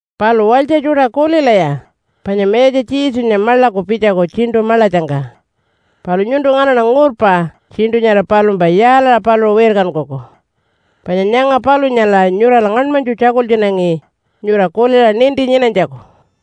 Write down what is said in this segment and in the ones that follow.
Palu walytja tjuṯa kulilaya, panya Mayatja Jesunya maḻaku pitjaku tjiṉṯu maḻatjangka. Palu nyuntu nganaṉa ngurpa tjiṉṯu nyara palumpa yaalaṟa paluṟu wirkankuku. Panya nyanga palunyala nyurala ngaṉmanytju tjakultjunangi nyura kuliṟa ninti nyinanytjaku.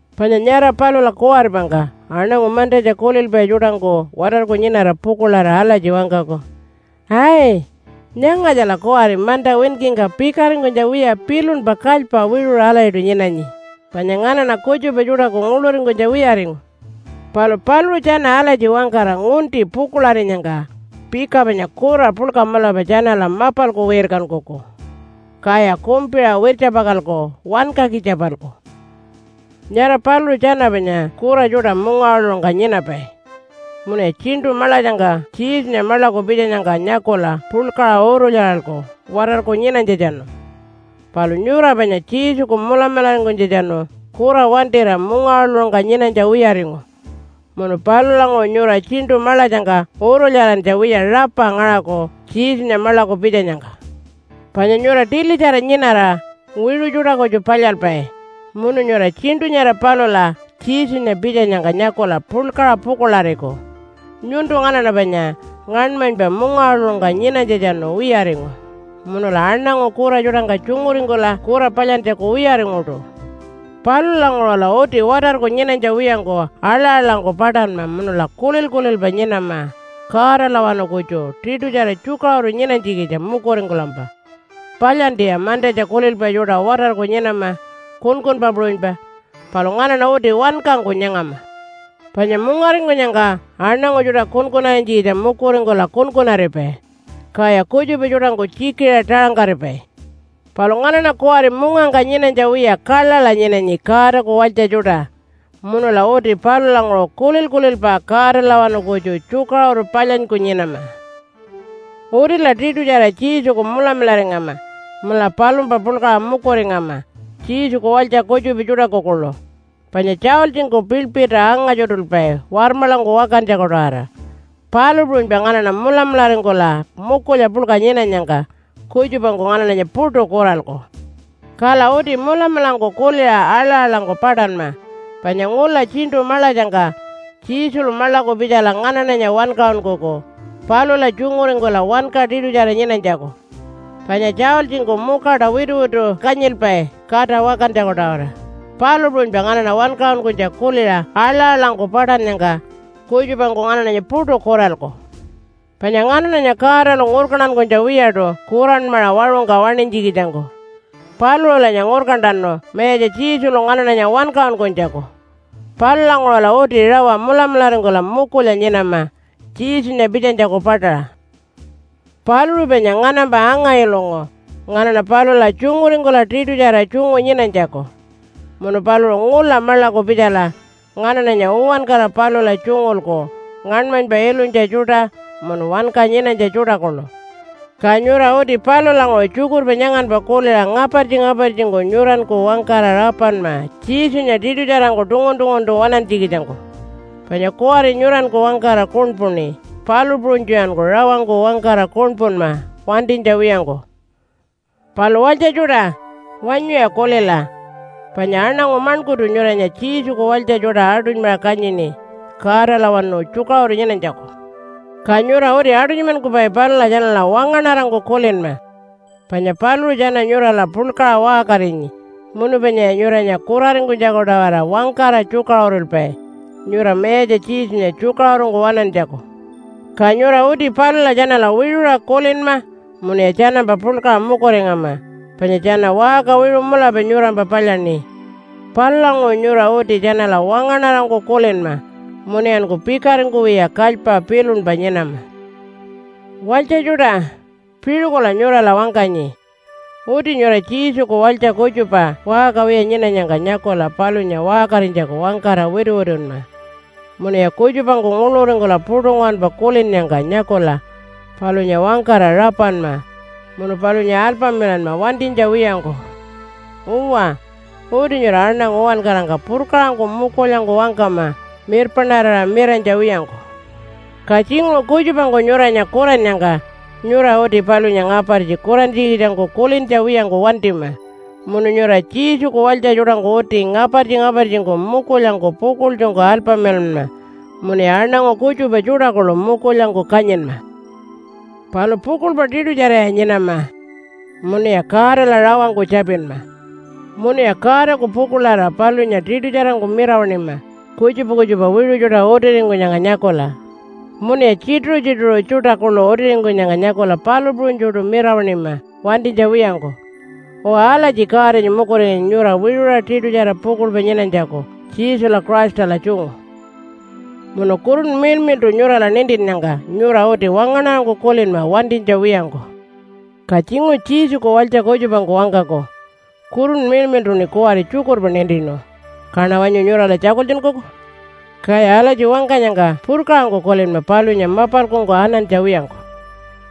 Panya nyara palula kuwaripangka aṉangu mantatja kulilpai tjuṯangku watarku nyinara pukuḻarira alatji wangkaku, “Ai, nyangatjala kuwari manta winkingka pikaringkunytja wiya pilunpa kalypa wiṟuṟa alatjiṯu nyinanyi, panya nganaṉa kutjupa tjuṯaku nguḻuringkunytja wiyaringu.” Palu paluṟu tjana alatji wangkara ngunti pukuḻarinyangka pika panya kura puḻka mulapa tjanala mapalku wirkankuku. Kaya kumpiṟa wirtjapakalku wankakitja-palku. Nyara paluṟu tjana panya kura tjuṯa mungawaḻuṟungka nyinapai. Munuya tjiṉṯu maḻatjangka Jesunya maḻaku pitjanyangka nyakula puḻkaṟa urulyaralku watarku nyinanytjatjanu. Palu nyura panya Jesuku mulamularingkunytjatjanu kura wantira mungawaḻuṟungka nyinanytja wiyaringu, munu palulanguṟu nyura tjiṉṯu maḻatjangka urulyarantja wiya rapa ngaṟaku Jesunya maḻaku pitjanyangka. Panya nyura tilitjara nyinara wiṟu tjuṯa kutju palyalpai, munu nyura tjiṉṯu nyara palula Jesunya pitjanyangka nyakula puḻkaṟa pukuḻariku. Nyuntu nganaṉa panya ngaṉmanypa mungawaḻuṟungka nyinanytjatjanu wiyaringu, munula aṉangu kura tjuṯangka tjunguringkula kura palyantjaku wiyaringuṯu. Palulanguṟula uti watarku nyinanytja wiyangku aḻa-aḻangku paṯanma munula kulil-kulilpa nyinama Godalawanu kutju tiṯutjara tjukaṟuru nyinanytjikitja mukuringkulampa. Palyantiya mantatja kulilpai tjuṯa watarku nyinama kunkunpa puṟunypa, palu nganaṉa uti wankangku nyangama. Panya mungaringkunyangka aṉangu tjuṯa kunkunarinytjikitja mukuringkula kunkunaripai. Kaya kutjupa tjuṯangku tjikiṟa taṟangkaripai. Palu nganaṉa kuwari mungangka nyinanytja wiya kaḻaḻa nyinanyi Godaku walytja tjuṯa. Munula uti palulanguṟu kulil-kulilpa Godalawanu kutju tjukaṟuru palyanyku nyinama. Utila tiṯutjara Jesuku mulamularingama munula palumpa puḻkaṟa mukuringama Jesuku walytja kutjupa tjuṯaku kuḻu. Panya tjaultjingku piḻpirta anga-tjuṯulpai warmaḻangku wakantjaku-tawara, palu puṟunypa nganaṉa mulamularingkula mukulya puḻka nyinanyangka kutjupangku nganaṉanya puṯu kuralku. Kala uti mulamulangku kuliṟa aḻa-aḻangku paṯanma panya ngula tjiṉṯu maḻatjangka Jesulu maḻaku pitjala nganaṉanya wankaṟunkuku palula tjunguringkula wanka tiṯutjara nyinanytjaku. Panya tjaultjingku mukaṯa wituwitu kanyilpai kata wakantjaku-tawara, palu puṟunypa nganaṉa wankaṟunkunytja kuliṟa aḻa-aḻangku paṯannyangka kutjupangku nganaṉanya puṯu kuralku. Panya nganaṉanya Godalu ngurkantankunytja wiyaṯu kuranmaṟa waṟungka waṉinytjikitjangku. Paluṟulanya ngurkantanu Mayatja Jesulu nganaṉanya wankaṟunkunytjaku. Palulanguṟula uti rawa mulamularingkula mukulya nyinama Jesunya pitjanytjaku paṯaṟa. Paluṟu panya nganampa anga-ilungu nganaṉa palula tjunguringkula tiṯutjara tjungu nyinanytjaku. Munu paluṟu ngula maḻaku pitjala nganaṉanya uwankara palula tjungulku ngaṉmanypa ilunytja tjuṯa munu wanka nyinanytja tjuṯa kuḻu. Ka nyura uti palulanguṟu tjukurpa nyanganpa kuliṟa ngapartji-ngapartjingku nyuranku wangkara rapanma Jesunya tiṯutjarangku tungun-tunguntu waṉantjikitjangku. Panya kuwari nyuranku wangkara kuṉpuṉi, palu puṟunytjuyanku rawangku wangkara kuṉpunma wantinytja wiyangku. Palu walytja tjuṯa, wanyuya kulila. Panya aṉangu maṉkurtu nyuranya Jesuku walytja tjuṯa aṯunymaṟa kanyini Godalawanu tjukaṟuru nyinanytjaku. Ka nyura uti aṯunymankupai palula tjanala wangaṉarangku kulinma. Panya paluṟu tjana nyurala puḻkaṟa waṟkarinyi munu panyaya nyuranya kuraringkunytjaku-tawara wangkara tjukaṟurulpai nyura Mayatja Jesunya tjukaṟurungku waṉantjaku. Ka nyura uti palula tjanala wiṟuṟa kulinma munuya tjanampa puḻkaṟa mukuringama, panya tjana waṟka wiṟu mulapa nyurampa palyaṉi. Palulanguṟu nyura uti tjanala wangaṉarangku kulinma. Munuyanku pikaringkuwiya kalypa pilunpa nyinama. Walytja tjuṯa, piṟukula nyurala wangkanyi. Uti nyura Jesuku walytja kutjupa waṟka wiya nyinanyangka nyakula palunya waṟkarinytjaku wangkara wituwitunma. Munuya kutjupangku nguḻuringkula puṯu nguwanpa kulinnyangka nyakula palunya wangkara rapanma munu palunya alpamilanma wantinytja wiyangku. Uwa, uti nyura aṉangu uwankarangka purkaṟangku mukulyangku wangkama mirpaṉarira miranytja wiyangku. Ka tjinguṟu kutjupangku nyuranya kurannyangka nyura uti palunya ngapartji kurantjikitjangku kulintja wiyangku wantima. Munu nyura Jesuku walytja tjuṯangku uti ngapartji-ngapartjingku mukulyangku pukuḻtjungku alpamilanma munuya aṉangu kutjupa tjuṯa kuḻu mukulyangku kanyinma. Palu pukuḻpa tiṯutjaraya nyinama. Munuya Godala rawangku tjapinma. Munuya Godaku pukuḻarira palunya tiṯutjarangku mirawaṉima kutjupa kutjupa wiṟu tjuṯa utiringkunyangka nyakula, munuya tjituṟu-tjituṟu tjuṯa kuḻu utiringkunyangka nyakula palu puṟunytjuṯu mirawaṉima wantinytja wiyangku. Uwa, alatji Godanya mukuringanyi nyura wiṟuṟa tiṯutjara pukuḻpa nyinanytjaku Jesula Christala tjungu. Munu Kurunpa Miḻmiḻṯu nyurala nintinnyangka nyura uti wangaṉarangku kulinma wantinytja wiyangku. Ka tjinguṟu Jesuku walytja kutjupangku wangkaku, “Kurunpa Miḻmiḻṯuṉi kuwari tjukurpa nintinu. Kaṉa wanyu nyurala tjakultjunkuku?” Kaya alatji wangkanyangka purkaṟangku kulinma palunya mapalkungku anantja wiyangku.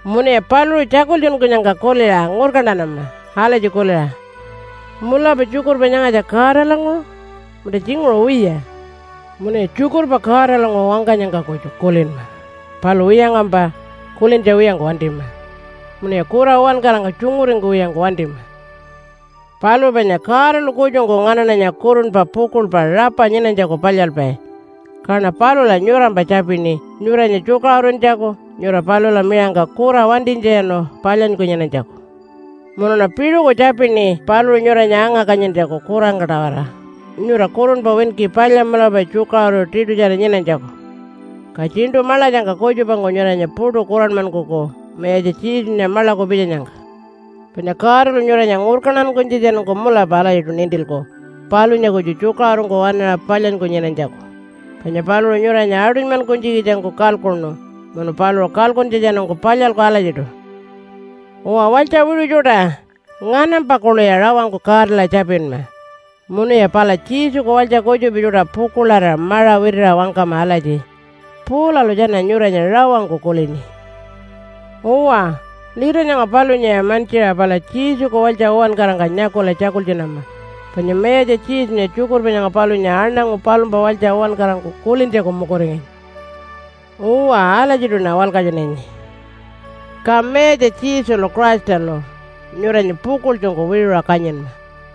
Munuya paluṟu tjakultjunkunyangka kuliṟa ngurkantanama alatji kuliṟa, “Mulapa tjukurpa nyangatja Godalanguṟu, munta tjinguṟu wiya?” Munuya tjukurpa Godalanguṟu wangkanyangka kutju kulinma. Palu wiyangkampa kulintja wiyangku wantima. Munuya kura uwankarangka tjunguringkuwiyangku wantima. Palu panya Godalu kutjungku nganaṉanya kurunpa pukuḻpa rapa nyinanytjaku palyalpai. Kaṉa palula nyurampa tjapini nyuranya tjukaṟuruntjaku nyura palula miṟangka kura wantinytjatjanu palyanyku nyinanytjaku. Munuṉa piṟuku tjapini paluṟu nyuranya anga-kanyintjaku kurangka-tawara, nyura kurunpa winki palya mulapa tjukaṟuru tiṯutjara nyinanytjaku, ka tjiṉṯu maḻatjangka kutjupangku nyuranya puṯu kuranmankuku Mayatja Jesunya maḻaku pitjanyangka. Panya Godalu nyuranya ngurkantankunytjatjanungku mulapa alatjiṯu nintilku palunya kutju tjukaṟurungku waṉaṟa palyanyku nyinanytjaku, panya paluṟu nyuranya aṯunymankunytjikitjangku kalkuṉu munu paluṟu kalkuntjatjanungku palyalku alatjiṯu. Uwa walytja wiṟu tjuṯa, nganampa kuḻuya rawangku Godala tjapinma. Munuya pala Jesuku walytja kutjupa tjuṯa pukuḻarira maṟa witiṟa wangkama alatji, “Paulalu tjana nyuranya rawangku kulini.” Uwa, lita nyanga palunyaya mantjiṟa pala Jesuku walytja uwankarangka nyakula tjakultjunama, panya Mayatja Jesunya tjukurpa nyanga palunya aṉangu palumpa walytja uwankarangku kulintjaku mukuringanyi. Uwa, alatjiṯuṉa walkatjunanyi. Ka Mayatja Jesulu Christalu nyuranya pukuḻtjungku wiṟuṟa kanyinma.